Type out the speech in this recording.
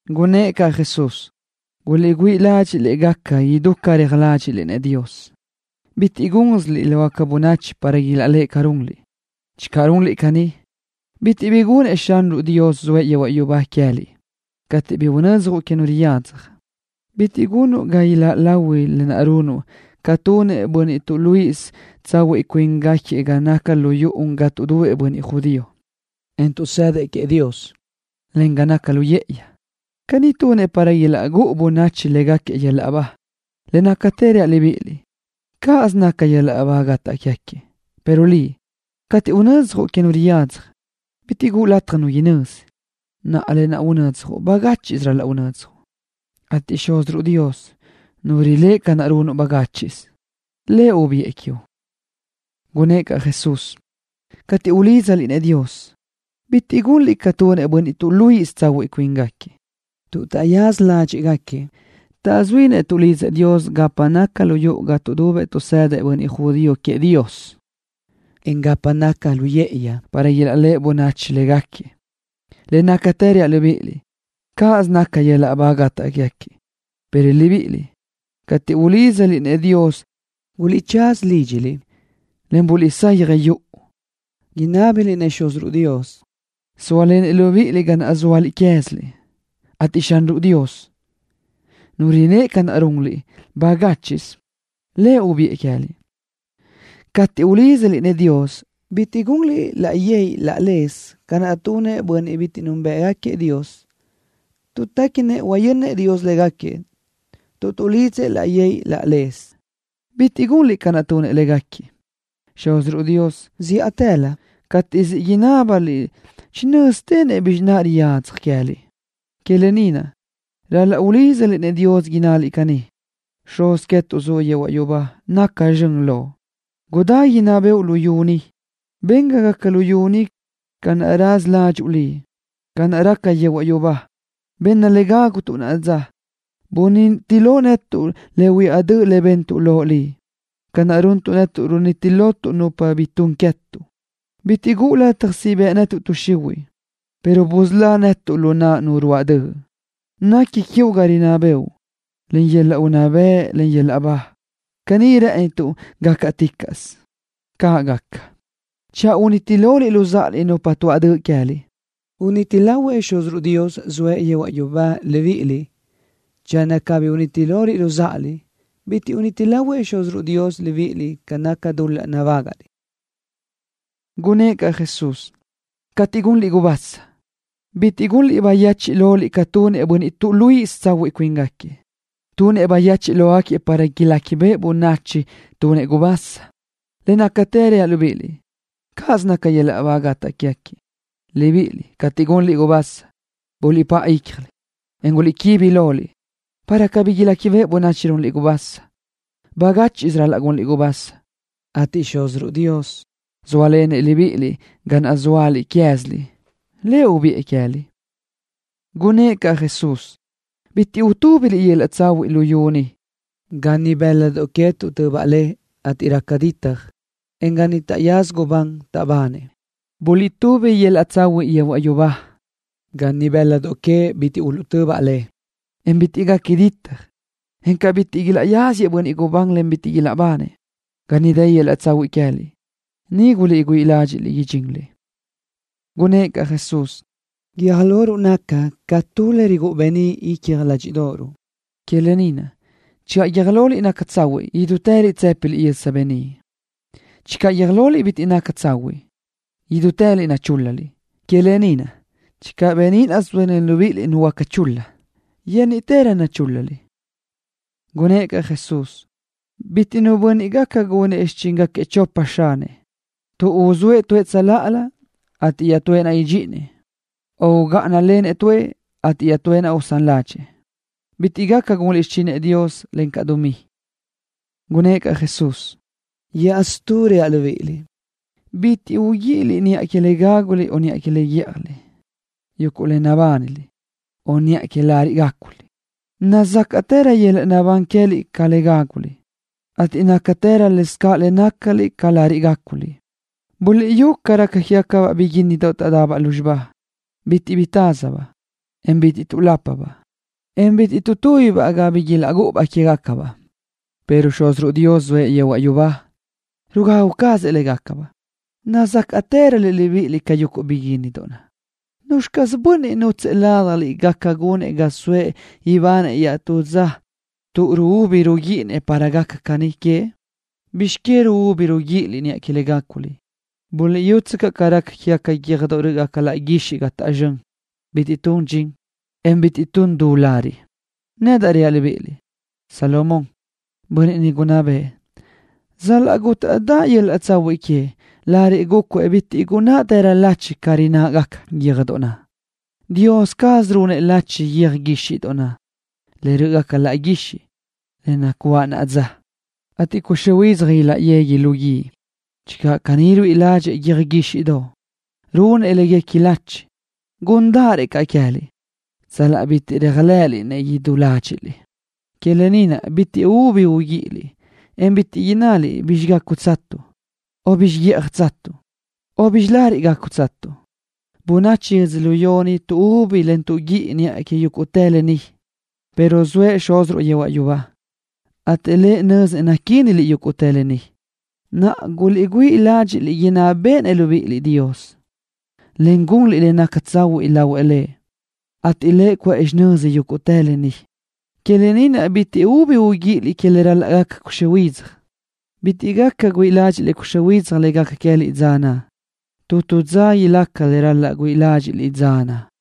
Gunnë́ʼ caʼ Jesús: —Guliʼgüíʼ ládxiʼliʼ gaca idú ca reaj ládxiʼliʼ-nëʼ Dios. Bitiʼ gúnsiliʼ lë ni lógaca bönachi para ilaʼléʼe ca naʼ runliʼ. Channö runliʼ caní, bitiʼ bi gunnëʼ Xúziruʼ Dios zoëʼ yehuaʼ yubá queë́liʼ. Cateʼ bi unödzjuʼ que nu bi riyadzaj, bitiʼ gunuʼ ga iláʼ lahui lë naʼ runuʼ ca tunëʼ bönniʼ tuʼluíʼisö tsahuiʼ cuíngaquiëʼ ga naca lu yuʼu ga tuʼdubëʼ bönniʼ judío, en tuʼsëdëʼ queëʼ Dios, encaʼ ga naca lu yë́ʼëyi. Caní tunëʼ para ilaʼgúʼu bönachi légaquiëʼ yöl-laʼ ba. Le nácatë reaʼ libíʼiliʼ, cáʼasö naca yöl-laʼ ba gataʼ quégaquiëʼ. Pero liʼ, cateʼ bi unödzjuʼ que nu bi riyadzaj, bitiʼ caʼ guʼu lataj nu inözi. Naʼa, lë naʼ unödzjuʼ, bagáchiʼsö ral-laʼ unödzjuʼ, ateʼ Xúziruʼ Dios, Nu riléʼe ca naʼ runuʼ bagáchiʼsö, Lëʼ ubiʼë quiuʼ. Gunnë́ʼ caʼ Jesús: —Cateʼ ulídzaliʼ-nëʼ Dios, bitiʼ gunliʼ ca tunëʼ bönniʼ tuʼluíʼisö tsahuiʼ cuíngaquiëʼ, tuʼ taʼyaza ládxiʼgaquiëʼ taʼzuínëʼ tuʼlidzëʼ Dios gapa naca lu yuʼu ga tuʼdubëʼ tuʼsëdëʼ bönniʼ judío queëʼ Dios, en gapa naca lu yë́ʼëyi para ilaʼléʼe bönachi légaquiëʼ. Le nácatë reaʼ libíʼiliʼ, cáʼasö naca yöl-laʼ ba gataʼ quégaquiëʼ. Pero libíʼiliʼ, cateʼ ulídzaliʼ-nëʼ Dios guliʼtsaza lídxiliʼ, en buliʼsayaj yuʼu. Buliʼlidzëʼ Dios inábiliʼ-nëʼ Xúziruʼ Dios, zóalenëʼ libíʼiliʼ ga naʼ zóaliʼ queë́ziliʼ, ateʼ Xúziruʼ Dios, Nu riléʼe ca runliʼ bagáchiʼsö, Lëʼ ubiʼë queë́liʼ. ’Cateʼ ulídzaliʼ-nëʼ Dios bitiʼ gunliʼ laʼ yë́ʼëyi laʼ lez ca naʼ tunëʼ bönniʼ bitiʼ núnbëʼgaquiëʼ Dios, tuʼ téquinëʼ huayönnëʼ Dios légaquiëʼ tuʼ tuʼlidzëʼ laʼ yë́ʼëyi laʼ lez. Bitiʼ gunliʼ ca naʼ tunëʼ légaquiëʼ. Xúziruʼ Dios, zíʼatëlö cateʼ siʼ inábaliʼ-nëʼ, chinö́z quézinëʼ le riyadzaj queë́liʼ. Que lë ni naʼ, ral-laʼ ulídzaliʼ-nëʼ Dios innaliʼ caní: Xuz netuʼ, zuʼ yehuaʼ yubá, gaca zxön Loʼ. Gudá inná bëʼu luyú ni. Ben ga gaca luyú ni ca raza ládxuʼu Liʼ ca naʼ raca yehuaʼ yubá. Benna le gágutuʼ naʼa dza. Buniti lo netuʼ le huiáʼ döʼ bentuʼ Loʼ Liʼ ca runtuʼ netuʼ, runiti lotuʼ nupa bi tun queë́tuʼ. Bitiʼ guʼu lataj siʼ bëʼ tuʼ xihuiʼ netuʼ, pero busölá netuʼ lu naʼ nu ruáʼ döʼ. Nequi quiuʼ ga rinná bëʼu, en yöl-laʼ unná bëʼ, en yöl-laʼ ba. Caní rë́ʼënituʼ gácaticaʼsö. ¡Caʼ gaca! ’Channö uniti loliʼ luzáʼaliʼ, nupa tuáʼ döʼ queë́liʼ, uniti lahuëʼ Xúziruʼ Dios, zoëʼ yehuaʼ yubá, libíʼiliʼ. Channö cabí uniti loliʼ luzáʼaliʼ, bitiʼ uniti lahuëʼ Xúziruʼ Dios libíʼiliʼ ca naca dul-laʼ nabágaʼliʼ. Gunnë́ʼ caʼ Jesús: —Cateʼ gunliʼ gubasa, bitiʼ gunliʼ bayechiʼ loliʼ ca tunëʼ bönniʼ tuʼluíʼisö tsahuiʼ cuíngaquiëʼ, tuʼ tunëʼ bayechiʼ lógaquiëʼ para iléquibeʼe bönachi tunëʼ gubasa. Le nácatë reaʼ libíʼiliʼ, cáʼasö naca yöl-laʼ ba gataʼ quégaquiëʼ. Libíʼiliʼ, cateʼ gunliʼ gubasa, buliʼpáʼa ícjaliʼ, en guliʼquibi loliʼ, para cabí iléquibeʼe bönachi runliʼ gubasa. Bagáchiʼsö ral-laʼ gunliʼ gubasa, ateʼ Xúziruʼ Dios, zóalenëʼ libíʼiliʼ ga naʼ zóaliʼ queë́ziliʼ, Lëʼ ubiʼë queë́liʼ. Gunnë́ʼ caʼ Jesús: —Bitiʼ utúbiliʼ yöl-laʼ tsahuiʼ luyú ni, ga ni bë́ladoʼ que tuʼtöbaʼ le, ateʼ raca ditaj, en ga ni taʼyaza gubán, taʼbanëʼ. Buliʼtubi yöl-laʼ tsahuiʼ yehuaʼ yubá, ga niʼ bë́ladoʼ que bitiʼ uluʼtöbaʼ le, en bitiʼ gaca ditaj, en ga niʼ bitiʼ ilaʼyáziëʼ bönniʼ gubán, en bitiʼ ilaʼbanëʼ. Ga niʼ dë yöl-laʼ tsahuiʼ queë́liʼ, niʼ güíʼi ládxiʼliʼ idxinliʼ. Gunnë́ʼ caʼ Jesús: —Guiöj loruʼ naca ca tu le rigúʼu beníʼ icja ládxiʼdoʼoruʼ. Que lë ni naʼ, channö guiö́j loliʼ naca tsahuiʼ, idútëliʼ tsë́piliʼ yösa beníʼ. Channö guiö́j loliʼ bitiʼ naca tsahuiʼ, idútëliʼ nachúl-laliʼ. Que lë ni naʼ, channö beníʼ zóalen libíʼiliʼ nuhuöáca le naca chul-la, yénniʼtërö nachúl-laliʼ. Gunnë́ʼ caʼ Jesús: —Cuntu nu bönniʼ gaca gunëʼ xichíngaquiëʼ chopa xanëʼ, tuʼ uzóëʼ tuëʼ tsöláʼalö, ateʼ iaʼtúëʼ naʼ idxíʼinëʼ, o ugáʼanalenëʼ tuëʼ, ateʼ iaʼtúëʼ naʼ usán ládxëʼë. Bitiʼ gaca gunliʼ xichinëʼ Dios, encaʼ dumí. Gunnë́ʼ caʼ Jesús: —Iaʼstú reaʼ libíʼiliʼ: Bitiʼ ubi uguíʼiliʼ niʼa que le gáguliʼ o niʼa que le guíʼjaliʼ, yuguʼ le nabániliʼ, o niʼa que lariʼ gáculiʼ. Nazácaʼtërö yöl-laʼ naʼbán queë́liʼ ca le gáguliʼ, ateʼ nácatërö lesacaʼ le nácaliʼ ca lariʼ gáculiʼ. Buliʼyú ca raca quégacabaʼ biguínnidoʼ taʼdabaʼ lúzxiba. Bitiʼ bi taz tuʼzóabaʼ, en bitiʼ tuʼlápabaʼ, en bitiʼ tuʼtúbibaʼ ga bi ilaʼgúʼubaʼ quégacabaʼ, pero Xúziruʼ Dios zoëʼ yehuaʼ yubá, rugagu cazëʼ légacabaʼ. Nazácaʼtëröliʼ libíʼiliʼ ca yuguʼ biguínnidoʼ naʼ. ¿Nuzxi caz bönniʼ nútsëʼë ládjaliʼ gaca gunëʼ ga soëʼ ibanëʼ iaʼtúz dza tuʼ ruúbi ruguíʼinëʼ para gaca caní queëʼ? ’¿Bizx que ruúbi ruguíʼiliʼ niʼa que le gáculiʼ? Buliʼyútsöcaʼ ca raca quégaca yöjdoʼ rö́ʼgaca laʼ guixiʼ ca taʼzxö́n. Bitiʼ tun dxin, en bitiʼ tun du lariʼ. Nedaʼ reaʼ libíʼiliʼ, Salomón, bönniʼ niʼ gunná bëʼë, sal-laʼ gútaʼdaʼ yöl-laʼ tsahuiʼ queëʼ, lariʼ gúcuëʼ bitiʼ gunnáʼtërö lachi ca rinnáʼgaca yöjdoʼ naʼ. Dios caz runëʼ lachi yöj guíxiʼdoʼ, le rö́ʼgaca laʼ guixiʼ, le nacuáʼ naʼa dza, ateʼ cuxö́ huidzaj ilaʼyegui lu guíʼ. Channö caní ruíʼi ládxëʼë yöj guíxiʼdoʼ, runëʼ léguequi lachi, gúndaʼarëʼ caʼ queë́liʼ, sal-laʼ bitiʼ réajlëʼëliʼ-nëʼ idú ládxiʼliʼ. Que lë ni naʼ, bitiʼ ubi uguíʼiliʼ, en bitiʼ innaliʼ: “¿Bizxi gágutsatuʼ?” o “¿Bizxi guíʼjatsatuʼ?” o “¿Bizxi lariʼ gácutsatuʼ?” Bönachi yödzölió ni tuʼúbi tuʼguíʼi niʼa que yúguʼtë lë ni, pero zoëʼ Xúziruʼ yehuaʼ yubá, ateʼ Lëʼ nö́zinëʼ naquíniliʼ yúguʼtë lë ni. Naʼa, guliʼgüíʼirö ládxiʼliʼ inná béʼenëʼ Dios libíʼiliʼ, en gunliʼ le naca tsahuiʼ lahuëʼ Lëʼ, ateʼ Lëʼ cuʼë xinö́zaliʼ yúguʼtë lë ni. Que lë ni naʼ, bitiʼ ubi uguíʼiliʼ niʼa que le ral-laʼ gaca cuxö́ huidzaj, tuʼ huáca güíʼi ládxiʼliʼ cuxö́ huidzaj le gaca queë́liʼ dza naʼ. Tu tu dza ilaca le ral-laʼ güíʼi ládxiʼliʼ dza naʼ.